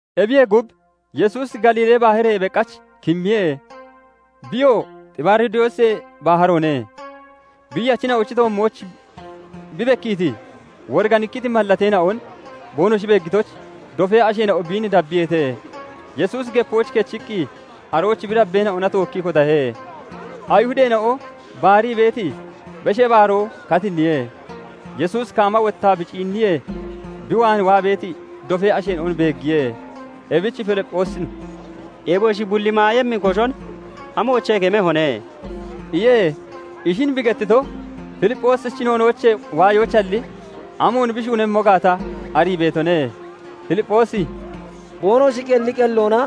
Ebiyee gub, Yesuusi Galiilee Baharoyee beqach kimmiye; biyoo Xibaaridoosee Baharoone. Biiyachina'ochi toommooch bi bekkiiti woriganikkiti mallateena'on boonoshi beeggitoyich dofee asheena'o biin dabbiyeete. Yesuusi gepooch kechiqqi arooch bi dabbeena'ona tookkii kotahe. Ayihudeena'o baarii beeti Beshee Baaroo katinniye. Yesuusi kaama wottaa bi ciinniyee, bi waan waa beeti dofee asheena'on beeggiye. Ebich Filipphoosin "Eboshi bulli maayemmi koshon amoochee kemehone?" iye. Ishin bi gettito Filipphoosichi noonoochee waayoyichalli, amoon bi shuunemmo gaata arii beetone. Filipphoosi "Boonoshi qelli qelloona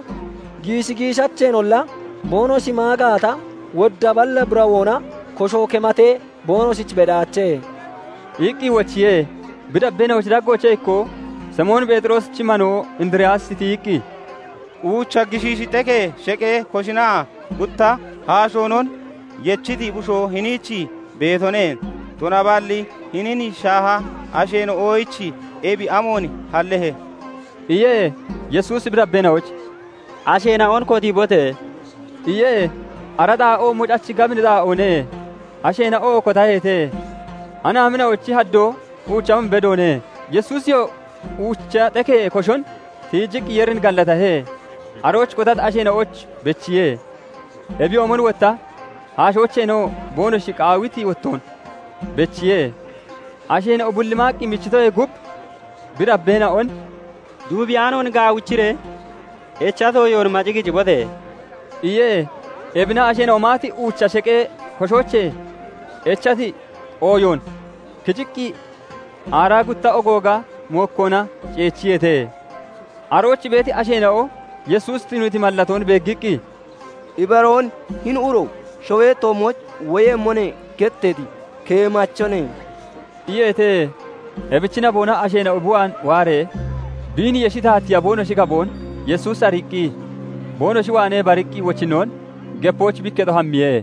giishi giishacheenolla boonoshi maa gaata, wodda balla birawoona kosho kematee boonoshich bedaache" iqqi wochiye. Bi dabbeena'ochi daggoochee ikkoo, Simoon Pheexiroosichi manoo Indiriyaasi tiyiqqi, "Uucha gishiishi xekee sheqee koshonaa gutta haashoonon yechiti bushoo hiniich beetone; tunaballi hinin shaaha asheena'oyich ebi amoon hallehe?" iye. Yesuusi bi dabbeena'oyich "Asheena'on kotiibote!" iye. Ara xaa'oo mocachi gabini xaa'oone. Asheena'oo kotaheete; anaamina'ochi haddoo uucha hum bedoone. Yesuusiyoo uucha xekee koshon tiijiqqi Yeerin gallatahe; arooch kotati asheena'oyichoo bechiye. Ebiyoomon wotta haashoocheenoo boonoshi qaawiti wottoon bechiye. Asheena'o bulli maaqqi michitoyee gub, bi dabbeena'on "Duubiyaanoon gaawichiree echati ooyoon maci kicibote!" iye. Ebina asheena'o maati Uucha sheqee koshoochee echati ooyoon kiciqqii aaraa gutta ogooga mokkoona ceechiyeete. Arooch beeti asheena'o Yesuusi tuniiti mallatoon beeggiqqi, "Ibaroon hini uro 'Shawee toommooch woyemmone' getteeti keemachone" iyeete. Ebichi naboona asheena'o bi waan waaree biin yeshi taatiiya boonoshi gaboon Yesuusi ariiqqi, boonoshi waanee bariqqi wochinnoon gepooch bi ikketo hammiye.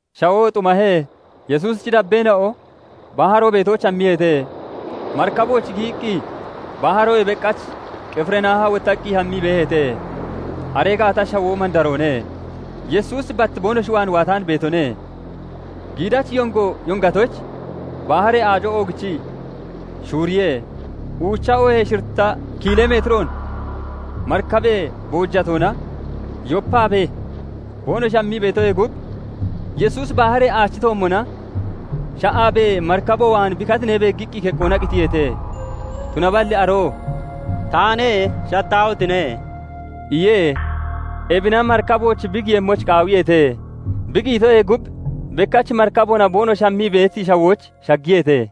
Shawoo xumahee, Yesuusichi dabbeena'o baharo beetooch hammiyeete; marikabooch giyiqqi baharoyee beqach Qifirnaaha wottaqqi hammii beeheete. Aree gaata shawoo mandaroone. Yesuusi bat boonoshi waan waataan beetone. Giidachi yongo yongatoyich, baharee aaco oogichii shuuriye. Uucha oohee shiritta kiilee metiroon marikabee boojatoona yopaabee boonoshi hammitoyee gub, Yesuusi baharee aachi toommona sha'aabee marikabo waan bi katinee beeggiqqi keqqoona qitiyeete. Tunaballi aroo "Taane; shattaahotine!" iye. Ebina marikabooch bi giyemmoyich qaawiyeete. Bi giyitoyee gub bekkach marikaboona boonoshi hammii beeti shawooch shaggiyeete.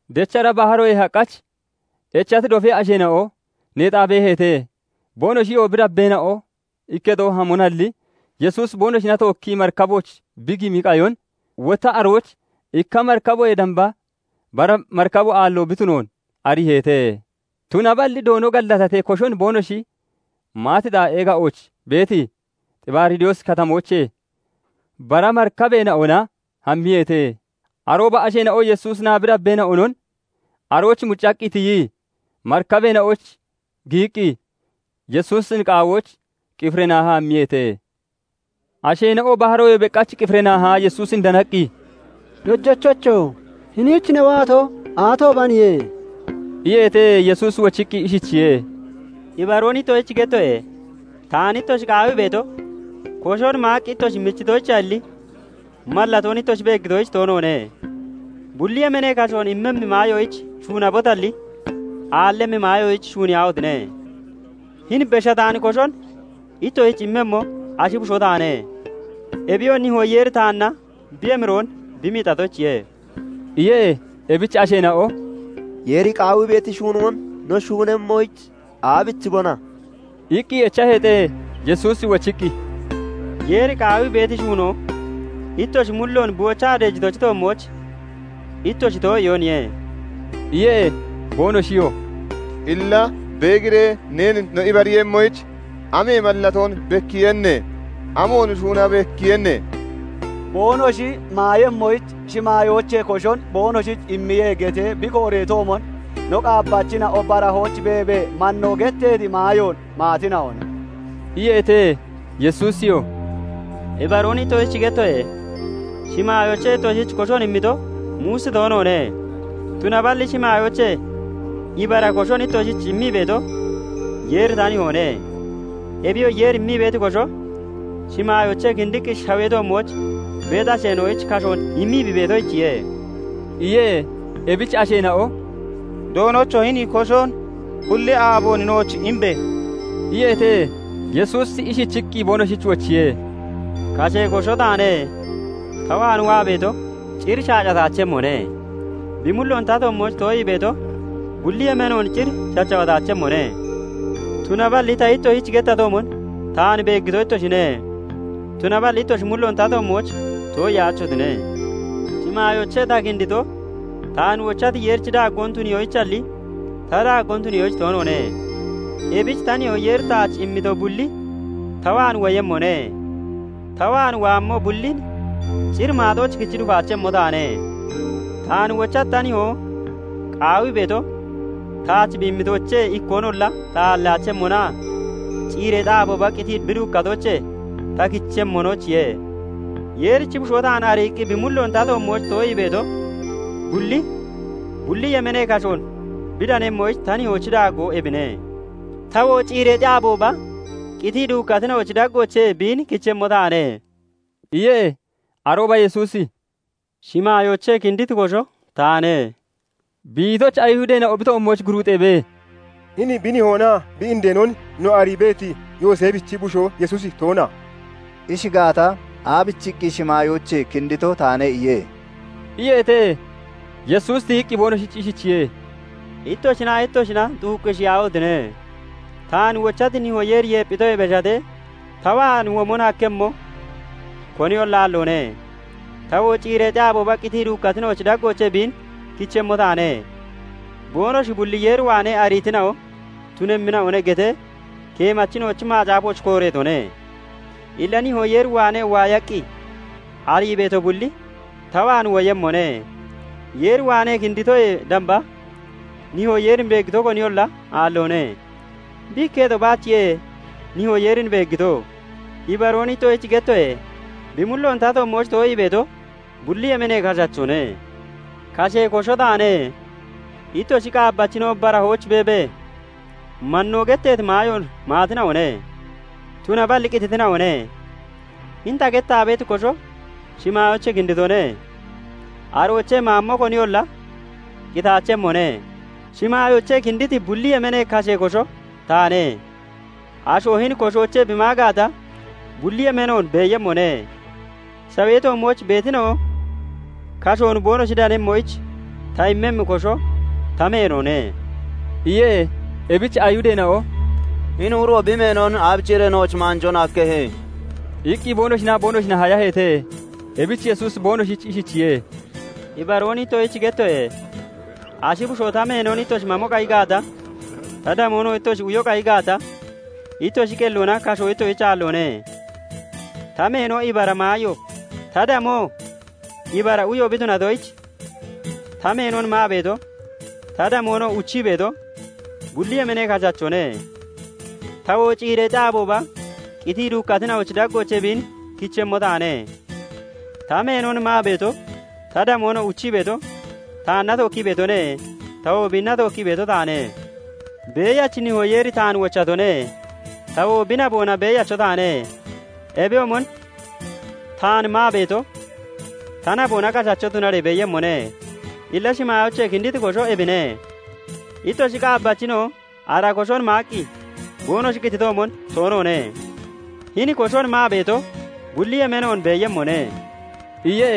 Dechara baharoyee haqach echati dofee asheena'o neexaa beeheete; boonoshiyoo bi dabbeena'o ikketo hamonalli Yesuusi boonoshina tookkii marikabooch bi gimi qayon, wotta arooch ikka marikaboyee damba bara marikabo aallo bi tunoon ariiheete. Tunaballi [Doono gallatatee] koshon boonoshi maati xaa'ee ga'ooch beeti Xibaaridoosi Katamoochee bara marikabeena'ona hammiyeete. Arooba asheena'o Yesuusinaa bi dabbeena'onon arooch muccaqqi tiyii marikabeena'ooch giyiqqi Yesuusin qaawoyich Qifirnaaha hammiyeete. Asheena'o baharoyee beqach Qifirnaahaa Yesuusin danaqqi, "Dojachocho! Hiniich ne waato aatoobaniye?" iyeete. Yesuusi wochiqqi ishichiye:- "Ibaroon ittoshich gettoye:- Taan ittoshi qaawii beeto, koshon maaqqi ittoshi michitoyichalli, mallatoon ittoshi beeggitoyich toonoone. Bulli yemeenee kashoon immemmi maayoyich shuunabotalli, aallemmi maayoyich shuuniyaahotine! Hini beshataani koshon ittoshich immemmo Ashi Bushoo taane; Ebiyoo Nihoo Yeeri taanna bi emiroon bi miixatoyichiye" iye. Ebich asheena'o "Yeeri qaawii beeti shuunoon no shuunemmoyich aabichibona?" iqqi echaheete. Yesuusi wochiqqi, "Yeeri qaawii beeti shuunoo, ittoshi mulloon bi wochaa deejitochi toommooch ittoshi too'iyooniye" iye. Boonoshiyoo "Illa beegiree neen no ibariiyemmoyich, amee mallatoon bekkiiyenne? Amoon shuuna bekkiiyenne? 'Boonoshi maayemmoyich shimaayoochee koshon boonoshich immiye' getee bi kooreetoomon, no qaabbachina'o barahooch beebee 'mannoo' getteeti maayoon maatina'one" iyeete. Yesuusiyoo "Ibaroon ittoshich gettoye. Shimaayoochee ittoshich koshon immito, Muusi toonoone; tunaballi shimaayoochee ibara koshon ittoshich immii beeto Yeeri ta Nihoone. Ebiyoo Yeeri immii beeti kosho, shimaayoochee kinddiqqi shawee toommooch beeti asheena'oyich kashoon immii bi beetoyichiye" iyee. Ebich asheena'o "Doonocho! Hini koshon bulli aaboon nooch imbe!" iyeete. Yesuusi ishichiqqi boonoshich wochiye:- "Kashee kosho taane; ta waan waa beeto cir shaacataachemmone; bi mulloon ta toommooch too'ii beeto, bulli yemeenoon cir shachawataachemmone. Tunaballi ta ittoshich gettatoomon [taan] beeggito ittoshine; tunaballi ittoshi mulloon ta toommooch too'iyaachotine. Shimaayoochee ta kindito, taan wochati Yeerichi daaggoon tuniyoyichalli, ta daaggoon tuniyoyich toonoone. Ebich ta Nihoo Yeeri taach immito bulli ta waan woyemmone; ta waan waammo bullin cir maaxooch kichi dufaachemmo taane. Taan wochati ta Nihoo qaawii beeto, taach bi immitoochee ikkoonolla ta aalliyaachemmonaa ciireexi aabooba qitii bi duukkatoochee ta kichemmonoyichiye. Yeerichi Bushoo taan ariiqqi bi mulloon ta toommooch too'ii beeto bulli, bulli yemeenee kashoon bi danemmoyich ta Nihoochi daaggoo ebine; tawoo ciireexi aabooba qitii duukkatina'ochi daggoochee biin kichemmo taane" iye. Arooba Yesuusi "Shimaayoochee kinditi kosho taane" bi itoyich, Ayihudeena'o bi toommooch guruuxeebee, "Hini bi nihoonaa bi indeenon no arii beeti Yooseefichi bushoo Yesuusi toona? Ishi gaata, aabichiqqi 'Shimaayoochee kindito taane' iye?" iyeete. Yesuusi tiyiqqi boonoshich ishichiye:- "Ittoshinaa ittoshina xuuqqisheyaahotine! Taan wochati Nihoo Yeeri yeepphitoyee beshatee, ta waan womon hakkemmo koniyolla aalloone; tawoo ciireexi aabooba qitii duukkatina'ochi daggoochee biin kichemmo taane. 'Boonoshi bulli Yeer waanee ariitina'o tunemmina'one' getee Keemachina'ochi Macaafooch kooreetone. Illa Nihoo Yeer waanee waayaqqi arii beeto bulli ta waan woyemmone. Yeer waanee kinditoyee damba, Nihoo Yeerin beeggito koniyolla aalloone; bi ikketo baachiye Nihoo Yeerin beeggito. Ibaroon ittoshich gettoye:- Bi mulloon ta toommooch too'ii beeto, bulli yemeenee kashachone. Kashee kosho taane. Ittoshi qaabbachina'o barahooch beebee 'mannoo' getteeti maayoon maatina'one; tunaballi qititina'one. Hini ta gettaa beeti kosho shimaayoochee kinditone; aroochee maammo koniyolla qitaachemmone. Shimaayoochee kinditi bulli yemeenee kashee kosho taane. Asho hini koshoochee bi maa gaata, bulli yemeenoon beeyemmone. Shawee toommooch beetina'o kashoon boonoshi danemmoyich ta immemmi kosho ta meenone" iye. Ebich Ayihudeena'o "Hini uro bi meenon aabichiree nooch maanjoon hakkehe?" iqqi boonoshinaa boonoshina hayaheete. Ebich Yesuusi boonoshich ishichiye:- "Ibaroon ittoshich gettoye:- Ashi Bushoo ta meenon ittoshi mamo qayi gaata, ta damoonoo ittoshi uyo qayi gaata, ittoshi qelloona kasho ittoshich aalloone. Ta meeno ibara maayo, ta damoo ibara uyo bi tunatoyich, ta meenon maa beeto, ta damoonoo uchii beeto, bulli yemeenee kashachone; tawoo ciireexi aabooba qitii duukkatina'ochi daggoochee biin kichemmo taane. Ta meenon maa beeto, ta damoonoo uchii beeto taanna tookkii beetone; tawoo biinna tookkii beeto taane. Beeyachi Nihoo Yeeri taan wochatone; tawoo bi naboona beeyacho taane. Ebiyoomon taan maa beeto, ta naboona kashacho tunaree beeyemmone. Illa shimaayoochee kinditi kosho ebine; ittoshi qaabbachina'o ara koshon maaqqi boonoshi qititoomon toonoone. Hini koshon maa beeto, bulli yemeenoon beeyemmone" iye.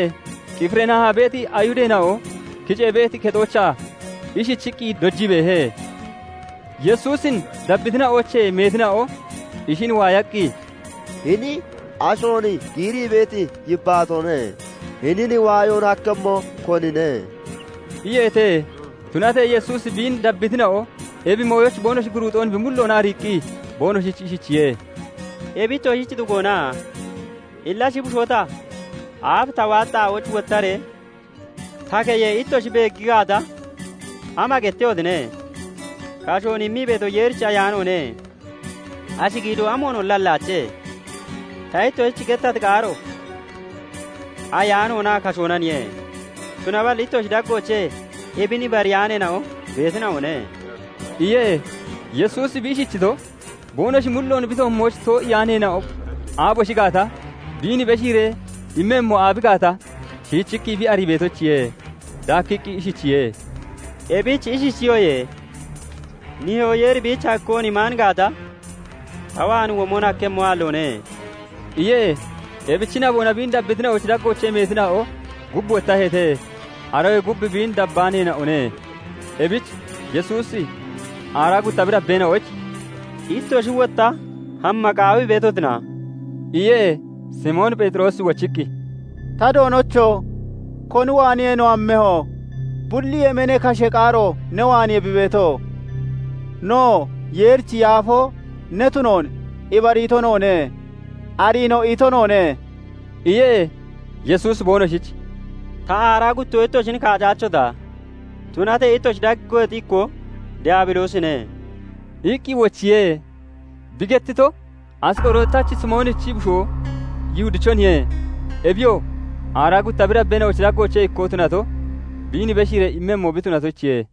Qifirnaaha beeti Ayihudeena'o kicee beeti kexoochaa ishichiqqi dojii beehe. Yesuusin dabbitina'oochee meetina'o ishin waayaqqi, "Hini ashoon giirii beeti yibbaatoone; hinin waayoon hakkemmo konine?" iyeete. Tunatee Yesuusi biin dabbitina'o ebi mooyoyich boonoshi guruuxoon bi mulloona ariiqqi boonoshich ishichiye:- "Ebi ittoshich xugoona? Illa Ashi Bushoo ta, aaf ta waati xaa'ooch wottaree ta keyee ittoshi beegi gaata, ama gettehotine? Kashoon immii beeto Yeerichi Ayaanoone; ashi giidoo amoonolla hallaache. Ta ittoshich gettati qaaro ayaanoonaa kashoonaniye. Tunaballi ittoshi daggoochee ebin ibariyaaneena'o beetina'one" iye. Yesuusi bi ishichito, boonoshi mulloon bi toommooch too'iyaaneena'o aaboshi gaata, biin beshiiree immemmo aabi gaata, shiichiqqi bi arii beetoyichiye. Daakkiqqi ishichiye:- "Ebich ishichiyoye:- 'Nihoo Yeeri biich hakkoon imaan gaata, ta waan womon hakkemmo aalloone' " iye. Ebichi naboona biin dabbitina'ochi daggoochee meetina'o gub wottaheete; aroyee gub biin dabbaaneena'one. Ebich Yesuusi aaraa gutta bi dabbeena'oyich "Ittoshi wotta hamma qaawii beetotina?" iye. Simoon Pheexiroosi wochiqqi, "Ta Doonocho! Koni waaniye no hammeho? Bulli yemeenee kashee qaaro ne waaniye bi beeto. Noo, Yeerichi Yaafoo ne tunoon ibariito noone; ariinoo ito noone" iye. Yesuusi boonoshich "Ta, aaraa guttoo ittoshin kaacaachota? Tunatee ittoshi daggeexi ikkoo Daabiloosine" iqqi wochiye. Bi gettito, Asqorootachi Simoonichi bushoo Yihudichoniye; Ebiyoo aaraa gutta bi dabbeena'ochi daggoochee ikkoo tunato biin beshiiree immemmo bi tunatoyichiye.